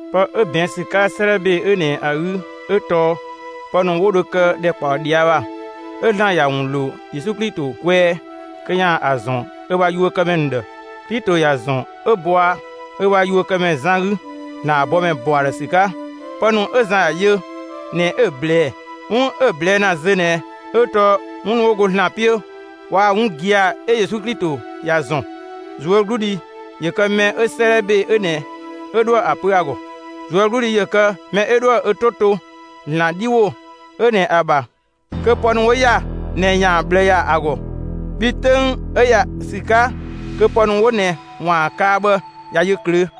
Pë 'ö ꞊bɛɛn' ‑sü 'ka 'sëëdhɛ ‑be 'ö ꞊nɛ ‑a 'gü 'ö tɔɔ pë ‑nu 'wo dho kë ‑dhɛkpaɔ ꞊dhia' ‑bha 'ö ‑Zlan ‑ya ‑wun ‑lo Yesu Klito kwɛɛ kö ‑yaan ‑a ‑zɔn ö ‑bha yuökëmɛ ‑nu ‑dhë. Klito ‑ya ‑zɔn 'ö bɔa ö ‑bha yuökëmɛ Zan 'gü, ‑Zlan ‑bha bɔmɛ ‑bɔ ‑a ‑dhë ‑sü 'ka. Pë ‑nu 'ö Zan ‑ya yö ꞊nɛ 'ö‑ ꞊blɛɛ. 'Wun 'ö‑ ꞊blɛɛ' ‑na zö ꞊nɛ 'ö tɔɔ 'wun ‑nu 'wo go ‑Zlan 'piö waa‑ 'wun gia‑ 'ö Yesu Klito ‑ya ‑zɔn. ꞊Zuögludhi ‑yö kë mɛ 'ö 'sëëdhɛ ‑be 'ö ꞊nɛ 'ö 'dhoë‑ ‑a pö ‑a ‑gɔ! ꞊Zuögludhi ‑yö kë mɛ 'ö 'dhoë‑ ö 'to to ‑Zlan 'dhi ‑wo 'ö ꞊nɛ ‑a ‑bha, kö pë ‑nu 'wo ‑ya ꞊nɛ ‑yaan ꞊bhlë ‑ya ‑a ‑gɔ! Bhii 'töng 'ö ‑ya ‑sü 'ka kö pë ‑nu 'wo ꞊nɛ ‑waan kaa bhë ꞊ya yö ꞊klöö'.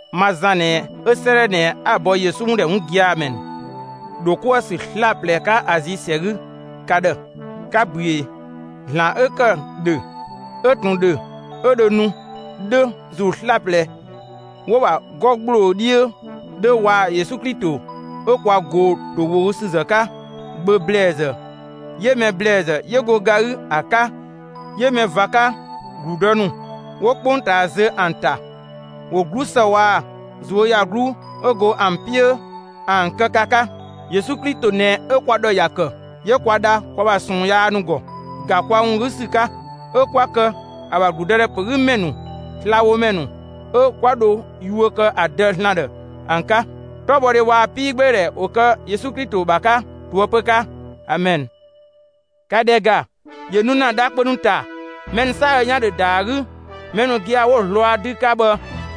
Ma Zan ꞊nɛ 'ö 'sëëdhɛ ꞊nɛ 'a‑ bɔ Yesu ‑wun ‑dhɛ 'wun gia‑ ‑mɛ ‑nu ‑dho 'kuë‑ ‑sü 'slaplɛ 'ka Azi ‑sɛ 'gü ka ‑dhë: 'Ka ꞊büee. ‑Zlan 'ö ‑kë ‑dhö, 'ö ꞊tun ‑dhö, 'ö dhö nu 'dhö, ‑zuu 'slaplɛ 'wo‑ ‑bha 'gɔ ‑gbloo 'dhiö 'dhö, waa‑ Yesu Klito 'ö kwa ꞊goo‑ ‑towogüsüzë 'ka, Gbö ‑blɛɛzë, 'yö mɛ ‑blɛɛzë 'yö go ga 'gü ‑a 'ka, 'yö mɛ ꞊va 'ka ‑gludë ‑nu 'wo 'kpongtaa zö ‑an ‑ta, ‑wo 'glusë waa‑ ꞊zuöyagluu 'ö go ‑an 'piö ‑an kë ka 'ka. Yesu Klito ꞊nɛ 'ö kwa ‑dhɔ ‑ya ‑kë, 'yö kwa dha kwa ‑bha ꞊sɔɔn yaa ‑nu ‑gɔ, ‑ga kwa ‑wun 'gü ‑sü 'ka. 'Ö 'kwa ‑kë ö ‑bha ‑gludëdhɛ ‑pö 'gü ‑mɛ ‑nu, slabhomɛ ‑nu 'ö 'kwa dho yuö kë ‑a Dë ‑Zlan ‑dhë ‑an 'ka. 'Tɔbhɔdhe waa‑ 'piigbeedhɛ ‑wo kë Yesu Klito ‑bha 'ka ꞊toëpö 'ka! (Amɛn!) ‑Ka ‑dhɛ ‑ga, ‑yö nu ‑na dha kpö ‑nu ‑ta; mɛ ‑nu 'saadhö 'yan ‑dhö ‑da ‑a 'gü; mɛ ‑nu gia‑ 'wo‑ zlɔa 'dü 'ka bhë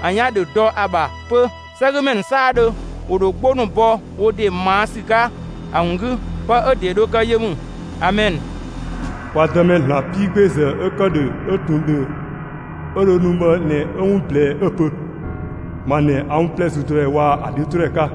‑an 'yan ‑dhö dɔ ‑a ‑bha 'pö. 'Sɛgümɛ ‑nu 'saadhö ‑wo ‑dho 'gbo ‑nu bɔ wo ‑de ꞊maa' ‑sü 'ka ‑a ‑wun 'gü. Pë 'ö ‑de dho kë yö ‑mü. Amɛn. Kwa Dëmɛ ‑Zlan 'piigbeezë, 'ö ‑kë ‑dhö, 'ö ꞊tun ‑dhö, 'ö dho nu bhë ꞊nɛ 'ö 'wun ꞊blɛɛ 'ö‑ pö: «Ma ꞊nɛ 'a 'wun 'plɛ züdɔdhɛ waa‑ ‑a 'dhiötodhɛ 'ka.»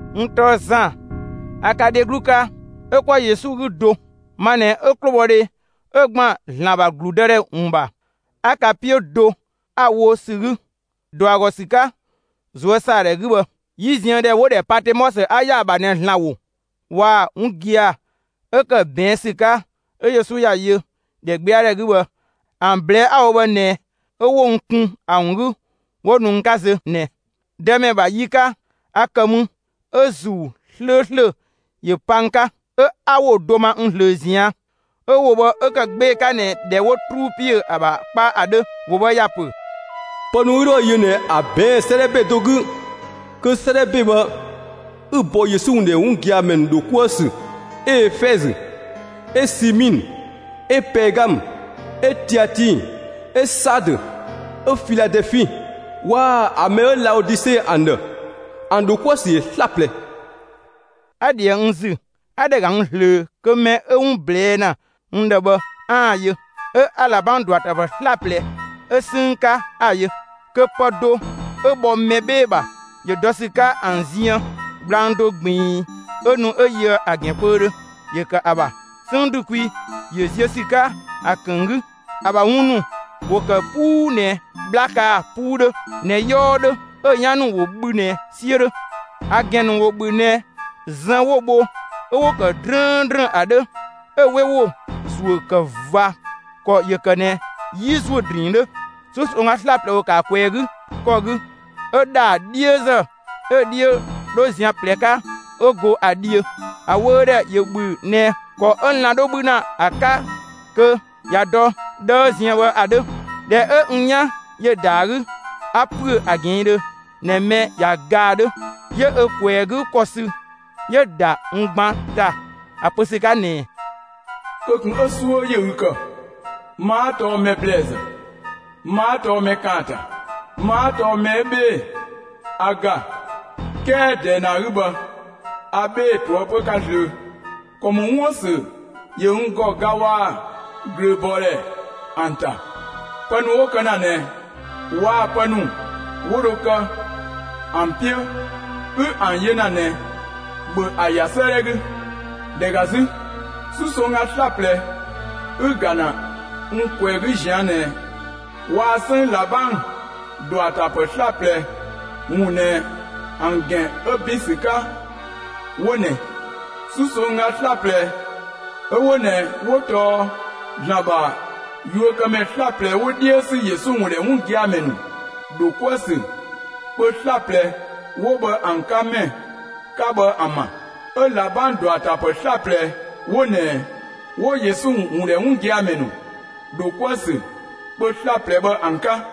N tɔɔ Zan; a ka dheglu 'ka, 'ö 'kwa Yesu 'gü do; ma ꞊nɛ 'ö 'klobhɔdhe 'ö ‑gban ‑Zlan ‑bha ‑gludëdhɛ ‑wun ‑bha, 'a ka 'piö do ‑a wo ‑sü 'gü, ‑dɔ ‑a ‑gɔ ‑sü 'ka ꞊zuösaadhɛ 'gü bhë. 'Yiziëndhɛ 'wo‑ ‑dhɛ Patemɔsö 'a ‑ya ‑a ‑bha ꞊nɛ, ‑Zlan ‑wo waa‑ 'wun gia‑ 'ö ‑kë ꞊bɛɛn' ‑sü 'ka 'ö Yesu ‑ya yö ‑dhɛgbɛadhɛ 'gü bhë ‑an ꞊blɛɛ'‑ 'a‑ wo bhë ꞊nɛ 'ö 'wo n kun ‑a ‑wun 'gü 'wo nu n 'ka zö ꞊nɛ. Dëmɛ ‑bha yi 'ka a ‑kë mü 'ö ‑Zuu 'slööslö ‑yö pa n 'ka, 'ö 'a ‑wo do ma n ꞊zlöö ꞊zian'. 'Ö ‑wo bhë 'ö ‑kë 'gbee‑ 'ka ꞊nɛ ꞊dhɛ 'wo 'truu ‑piö ‑a ‑bha 'kpa ‑a 'dhö. ‑Wo bhë ‑ya pö: «Pë ‑nu 'ü 'dhoë‑ yö ꞊nɛ ‑a ꞊bɛɛn' 'sëëdhɛ ‑be do 'gü, kö 'sëëdhɛ ‑be bhë 'ü‑ bɔ Yesu ‑wun ‑dhɛ 'wun gia‑ ‑mɛ ‑nu ‑dho 'kuë‑ ‑sü 'ö Efɛzö, 'ö Simiinë, 'ö Pɛɛgamë, 'ö Tiatii, 'ö Saadö, 'ö Filadɛɛfi waa‑ ‑a mɛ 'ö Laodise ‑an ‑dhë. ‑An ‑dho 'kuë‑ ‑sü ‑yö 'slaplɛ.» 'A ꞊dhië n ‑zü, 'a ‑dhɛ ‑ga n ꞊zlöö kö mɛ 'ö 'wun ꞊blɛɛ' ‑na n ‑dhë bhë 'aan‑ yö. 'Ö 'a ꞊labang ‑dɔatapë 'slaplɛ 'ö 'sënng 'ka ‑a yö. Kö pë do 'ö bhɔ mɛ 'bhee‑ ‑bha ‑yö dɔ ‑sü 'ka ‑an ziën. Gblang do ꞊gbiin 'ö nu 'ö yö ‑a ‑gɛn kpöödhö ‑yö ‑kë ‑a ‑bha; 'sënng ‑du kwi ‑yö ziö ‑sü 'ka ‑a ‑kënng 'gü. ‑A ‑bha wun ‑nu ‑wo kë 'puu ꞊nɛ 'bhla kaa‑ 'puu 'dhö ꞊nɛ 'yɔɔ 'dhö, 'ö‑ 'yan ‑nu ‑wo bhü ꞊nɛ 'siö 'dhö. ‑A ‑gɛn ‑nu ‑wo ‑bhü ꞊nɛ zën 'wo‑ bho 'ö 'wo‑ ‑kë 'drëëndrën ‑a 'dhö; 'ö‑ 'we ‑wo ‑zuö ‑kë ꞊va ‑kɔ ‑yö ‑kë ꞊nɛ 'yi ‑zuö ‑drinng 'dhö. 'Susongga 'slaplɛ ‑wo ‑kë ‑a ꞊kwɛɛ‑ 'gü ‑kɔ 'gü 'ö ‑dhaa 'dhiözë 'ö‑ 'dhiö 'dho zian ꞊plɛ 'ka 'ö go ‑a dhiö. ‑A wöödhɛ ‑yö ‑bhü ꞊nɛ ‑kɔ 'ö lan‑ 'dho 'bhü ‑na ‑a 'ka, kö ꞊ya dɔ 'dhëë ziën bhë ‑a 'dhö. ꞊Dhɛ 'ö n 'yan ‑yö ‑da ‑a 'gü, 'a ‑püö ‑a ꞊gɛɛndhö ꞊nɛ mɛ ꞊ya ga ‑a 'dhö. 'Yö ö ꞊kwɛɛ‑ 'gü ‑kɔ sü 'yö‑ ‑da n gban ‑ta ‑a pö ‑sü 'ka ꞊nɛɛ: «Kö ꞊kun 'ö 'suö ‑yö ü ‑kë! Ma 'a tɔɔ mɛ ‑blɛɛzë; ma 'a tɔɔ mɛ ‑kaanta. Ma 'a tɔɔ mɛ 'ö 'bhee‑; a ‑ga, 'kɛɛ ꞊dɛɛ ꞊nɛ ‑a 'gü bhë, a 'bhee‑ ꞊toëpö 'ka zlöö. ‑Kɔ ‑mɔ 'wuën‑ ‑sü ‑yö n ‑gɔ ga waa‑ ꞊glööbɔɔdhɛ ‑an ‑ta. Pë ‑nu 'wo kë ‑na ꞊nɛ waa‑ pë ‑nu 'wo dho kë ‑an 'piö 'ü ‑an yö ‑na ꞊nɛ, ‑bhö ‑a ‑ya 'sëëdhɛ 'gü! ‑Dhɛ ‑ga 'zü, 'susongga 'slaplɛ 'ü‑ ‑ga ‑na n ꞊kwɛɛ‑ 'gü ꞊zian' ꞊nɛ waa‑ 'sënng ꞊labang ‑dɔatapë 'slaplɛ ‑wun ꞊nɛ ‑an ‑gɛn 'ö ‑bin ‑sü 'ka 'wo ꞊nɛ: 'Susongga 'slaplɛ 'ö 'wo ꞊nɛ 'wo tɔɔ ‑Zlan ‑bha yuökëmɛ 'slaplɛ 'wo 'dhiö ‑sü Yesu ‑wun ‑dhɛ 'wun gia‑ ‑mɛ ‑nu ‑dho 'kuë‑ ‑sü kpö 'slaplɛ 'wo bhë ‑an 'ka ‑mɛ 'ka bhë ‑an ‑bha. 'Ö ꞊labang ‑dɔatapë 'slaplɛ 'wo ꞊nɛ 'wo Yesu ‑wun ‑dhɛ 'wun gia‑ ‑mɛ ‑nu ‑dho 'kuë‑ ‑sü kpö 'slaplɛ bhë ‑an 'ka.»